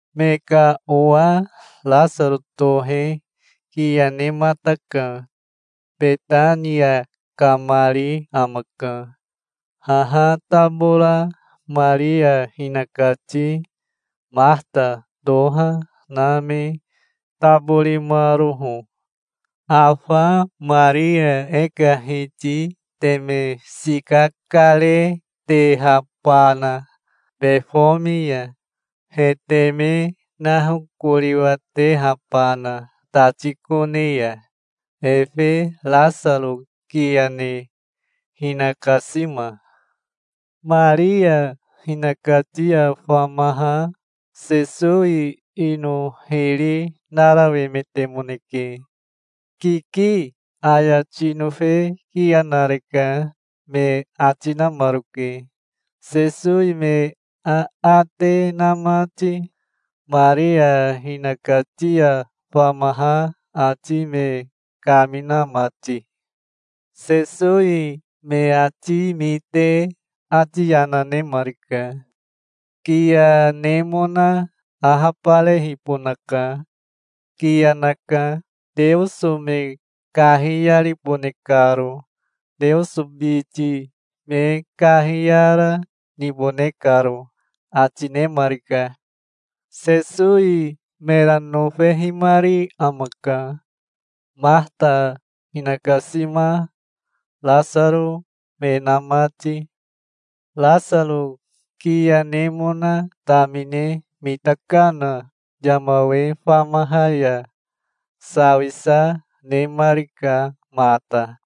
Me ka owa Rasaro tohe kiya nemataka. Betania kamari amaka, haha tabora Maria hinakati Mahata toha na me taborimaroho, afa Maria e ka Hiti teme sika karetehabana befomi ya, he teme nahokoriwatehabana tati kone ya, efe Rasaro kiya ne hinakasima. Maria hinakati ya famaha Sesowi ino hiri narawemetemoneke. "Kiki, aya tinofe kiya nareka", me ati namaroke, Sesowi me aate na mati, Maria hinakati ya famaha ati me kamina mati. Sesowi me ati mite ati yana nemarika. "Kiya nemona ahabarehibonaka. Kiya naka, Teoso me kahiyaribone karo, Teoso biti me kahiyara, nibone karo", ati nemarika. Sesowi mera nofehimari amaka, Mahata, hinakasima, Rasaro, me na mati. Rasaro kiya nemona tamine mitakana yama we famaha ya sawisa nemarika mata.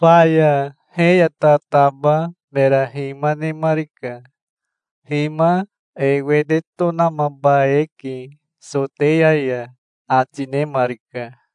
Faya he ya tataba mera hima nemarika. "Hima e wete tonamaba eke Soteya ya", ati nemarika.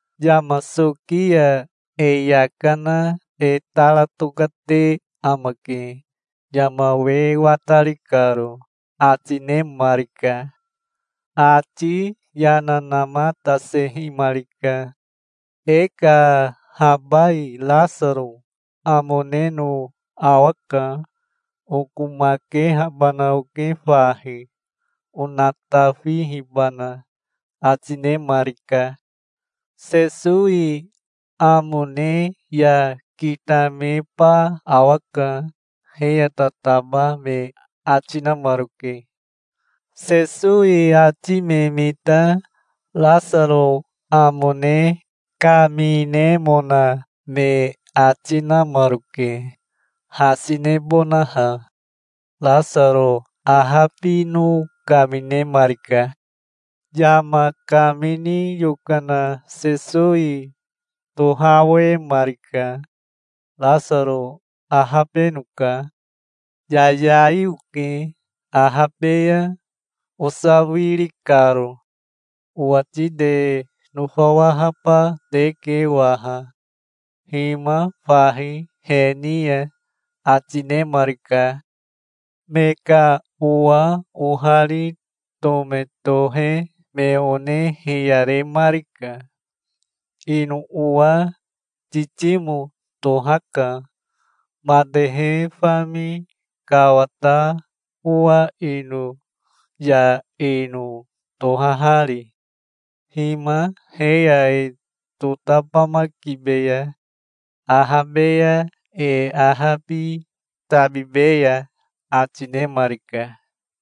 Yama soki ya e yaka na e tara tokate amake, yama we watari karo", ati nemarika. Ati yana namatasehimarika. "E ka habai Rasaro amo neno awaka. Okomakehabana oke fahi, onatafihibana", ati nemarika. "Sesowi amo ne ya kitameba awaka", he ya tataba me ati namaroke. Sesowi ati me mita Rasaro amo ne kaminemona me ati namaroke, hasi nebonaha. Rasaro ahabino kaminemarika. Yama kamini yokana Sesowi tohawemarika. "Rasaro ahabenoka. Yayai oke ahabe ya osawiri karo. Owati te nofawahaba teke waha. Hima fahi he ni ya", ati nemarika. Me ka owa ohari Tome tohe me one hiyaremarika. Ino owa Titimo tohaka, matehe fami kawata owa ino ya ino tohahari. "Hima he ya e totabamakibeya. Ahabe ya e ahabi tabibeya", ati nemarika.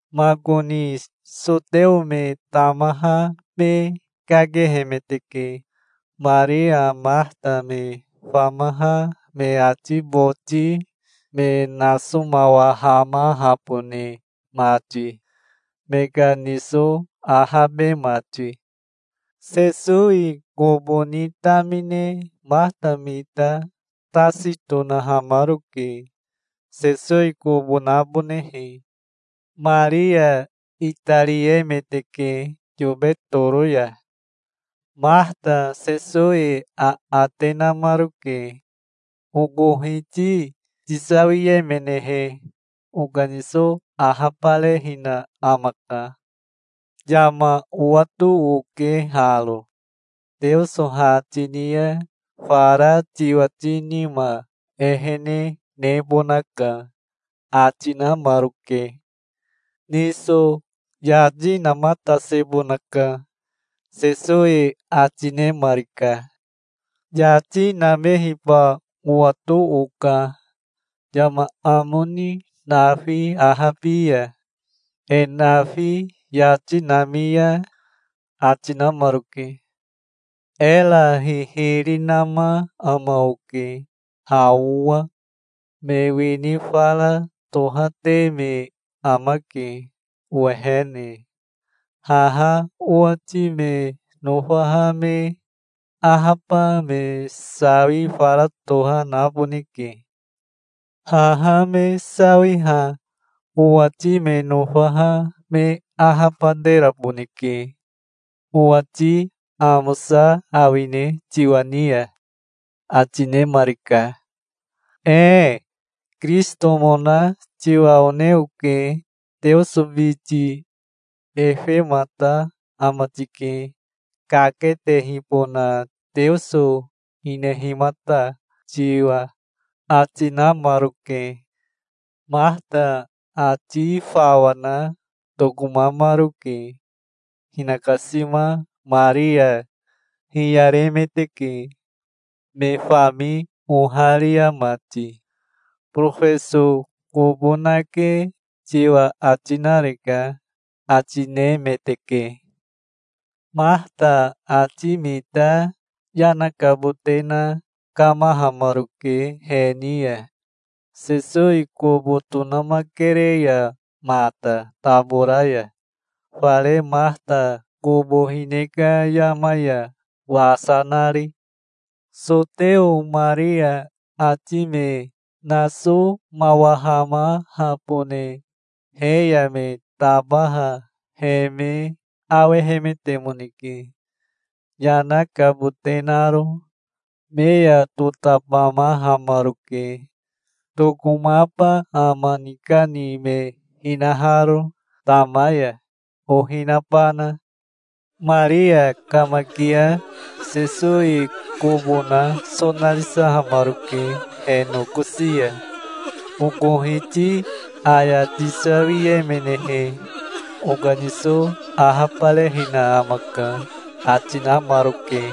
Makoni Soteo me tamaha me kakehemeteke, Maria Mahata me famaha me ati boti me nasomawahamahabone mati, me ka niso ahabe mati. Sesowi kobo ni tamine Mahata mita tasi tonahamaroke Sesowi kobo nabonehe. Maria itariemeteke yobe toro ya. Mahata Sesowi aate namaroke. "Oko Hiti tisawiemenehe, okaniso ahabarehina amaka. Yama owato oke haro. Teoso ha tini ya fara tiwati nima ehene nebonaka", ati namaroke. "Niso yati namatasebonaka", Sesowi ati nemarika. "Yati namehiba owato oka, yama amo ni nafi ahabi ya, e nafi yati nami ya", ati namaroke. "Era hihiri nama ama oke, ha owa. Me wini fara tohate me amake owehene. Haha owati me nofaha me ahaba me sawi fara toha naboneke. Haha me sawiha owati me nofaha me ahabateraboneke. Owati amosa awine tiwa ni ya?" ati nemarika. "Ee. Kirisitomona tiwa one oke, Teoso biti. Efemata ama tike, kaketehibona Teoso hinehimata tiwa", ati namaroke. Mahata ati fawa na tokomamaroke. Hinakasima Maria hiyaremeteke, me fami oharia mati. "Borofeso kobo nake tiwa ati nareka", ati nemeteke. Mahata ati mita yana kabote na kamahamaroke he ni ya, Sesowi kobo tonamakere ya mata tabora ya, fare Mahata kobo hine ka yama ya wasa nari. Soteo Maria ati me nasomawahamahabone he ya me tabaha he me awehemetemoneke, yana kabote naro. Me ya totabamahamaroke, tokomaba ama nikani me hinaharo tama ya, ohi nabana. Maria kamakia Sesowi kobo na sonarisahamaroke he nokosi ya. "Oko Hiti aya tisawiemenehe, okaniso ahabarehina amaka, ati namaroke.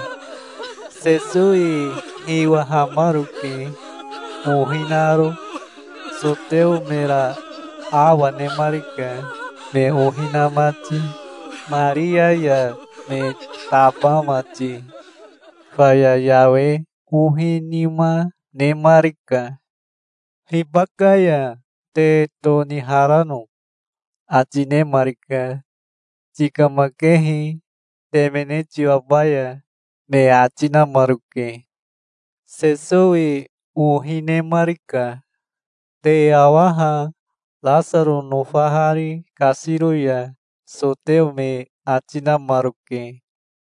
Sesowi hiwahamaroke ohi naro. Soteo mera awa nemarika, me ohi na mati, Maria ya me taba mati. Faya yawe ohi nima nemarika. "Hibaka ya te toniharano?" ati nemarika. "Tikamakehi, temene tiwabaya", me ati namaroke. Sesowi ohi nemarika. "Te awa ha, Rasaro nofahari kasiro ya", soteo me ati namaroke.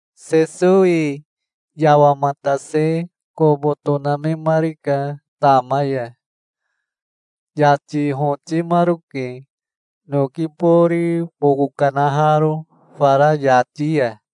Sesowi yawamatase kobo tonamemarika tama ya. Yati hotimaroke, noki bori boko kanaharo fara yati ya.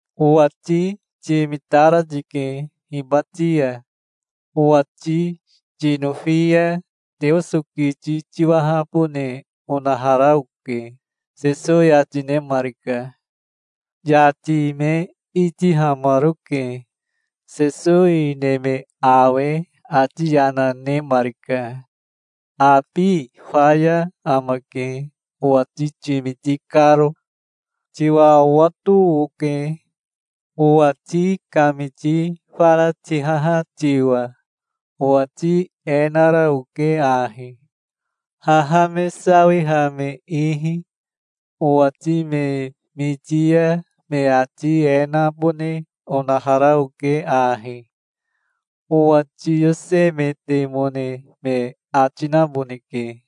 "Owati timitara tike hibati ya. Owati tinofi ya Teoso kiti tiwahabone onahara oke", Sesowi ati nemarika. Yati me itihamaroke. Sesowi neme awe ati yana nemarika. "Abi faya amake, owati timiti karo. Tiwa owato oke, owati kamiti fara tihaha tiwa. Owati e nara oke ahi haha me sawiha me ihi. Owati me miti ya me ati e nabone onahara oke ahi: Owa tiyosemetemone me ati naboneke",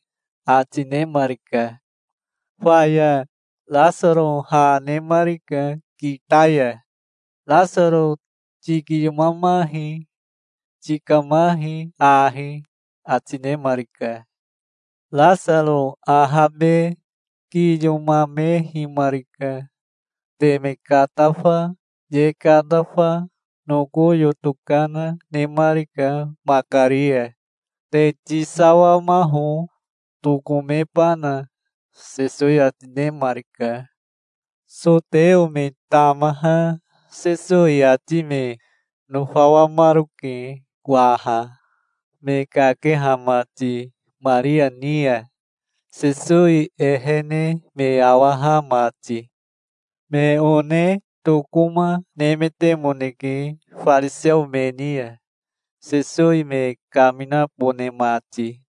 ati nemarika. Faya Rasaro ha nemarika kita ya. "Rasaro tikiyomamahi. Tikamahi ahi", ati nemarika. Rasaro ahabe kiyomamehimarika. Teme katafa, ye katafa, noko yoto kana nemarika makari ya. "Te tisawamaho, tokomebana", Sesowi ati nemarika. Soteo me tamaha Sesowi ati me nofawamaroke waha, me kakeha mati Maria ni ya, Sesowi ehene me awaha mati. Me one tokoma nemetemoneke fariseo me ni ya, Sesowi me kaminabone mati.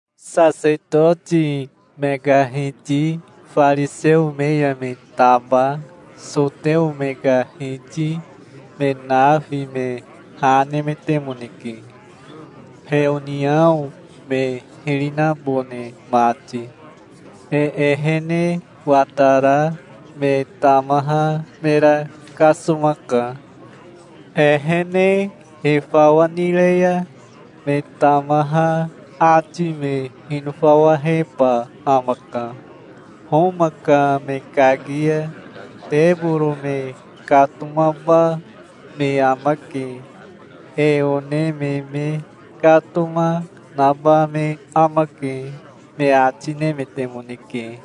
Sasetoti me ka hiti fariseo me ya me taba soteo me ka hiti me nafi me ha nemetemoneke, heoniao me hiri nabone mati. "E ehene watara me tamaha mera kasomaka. Ehene e fawa nire ya me tamaha ati me hinofawaheba amaka. Homa ka me kaki ya teboro me katomaba me amake. E one me me katoma naba me amake", me ati nemetemoneke.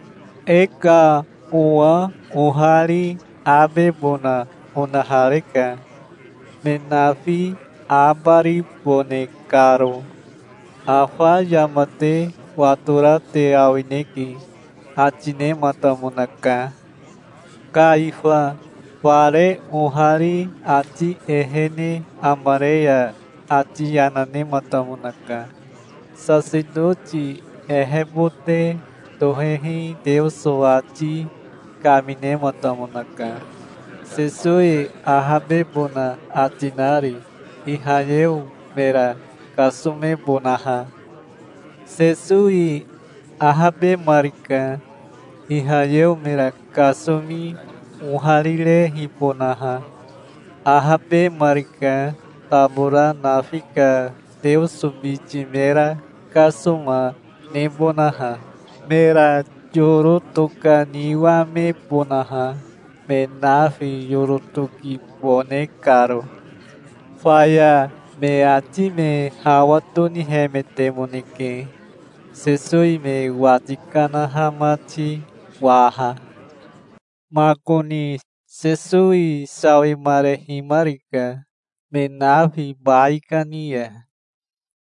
E ka owa ohari abebona onahareka, me nafi abaribone karo. Afa yama te watora te awineke", ati nematamonaka. Kaifa fare ohari ati ehene amare ya ati yana nematamonaka. Sasetoti ehebote tohehi Teoso ati kaminematamonaka, Sesowi ahabebona ati nari, Ihayeo mera kasomebonaha. Sesowi ahabemarika, Ihayeo mera kasomi oharirehibonaha. Ahabemarika, tabora nafi ka Teoso biti mera kasoma nebonaha, mera yoro tokaniwamebonaha, me nafi yoro tokibone karo. Faya me ati me hawa tonihemetemoneke, Sesowi me wati kanaha mati waha. Makoni Sesowi sawimarehimarika me nafi baikani ya.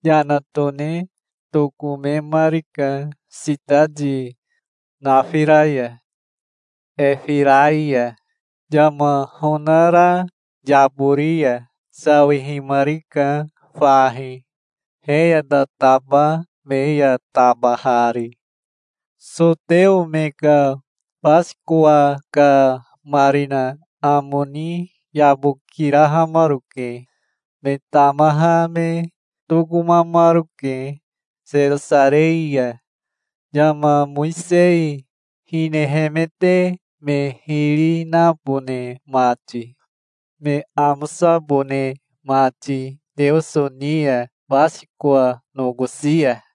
Yana tone tokomemarika sitati nafira ya Efirai ya, yama honara yabori ya. Sawihimarika fahi, he ya tataba me ya tabahari. Soteo me ka Basikowa ka marina amo ni yabokirahamaroke. Me tamaha me tokomamaroke Serosarei ya, yama Mowisei hinehemete me hiri nabone mati, me amosabone mati Teoso ni ya Basikowa nokosi ya.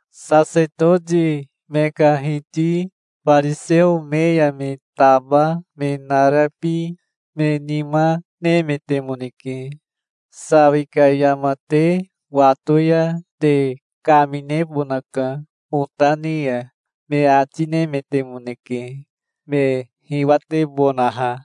Sasetoti me ka hiti fariseo me ya me taba me narabi me nima nemetemoneke. "Sawi ka yama te wato ya te kaminebonaka ota ni ya", me ati nemetemoneke, me hiwatebonaha.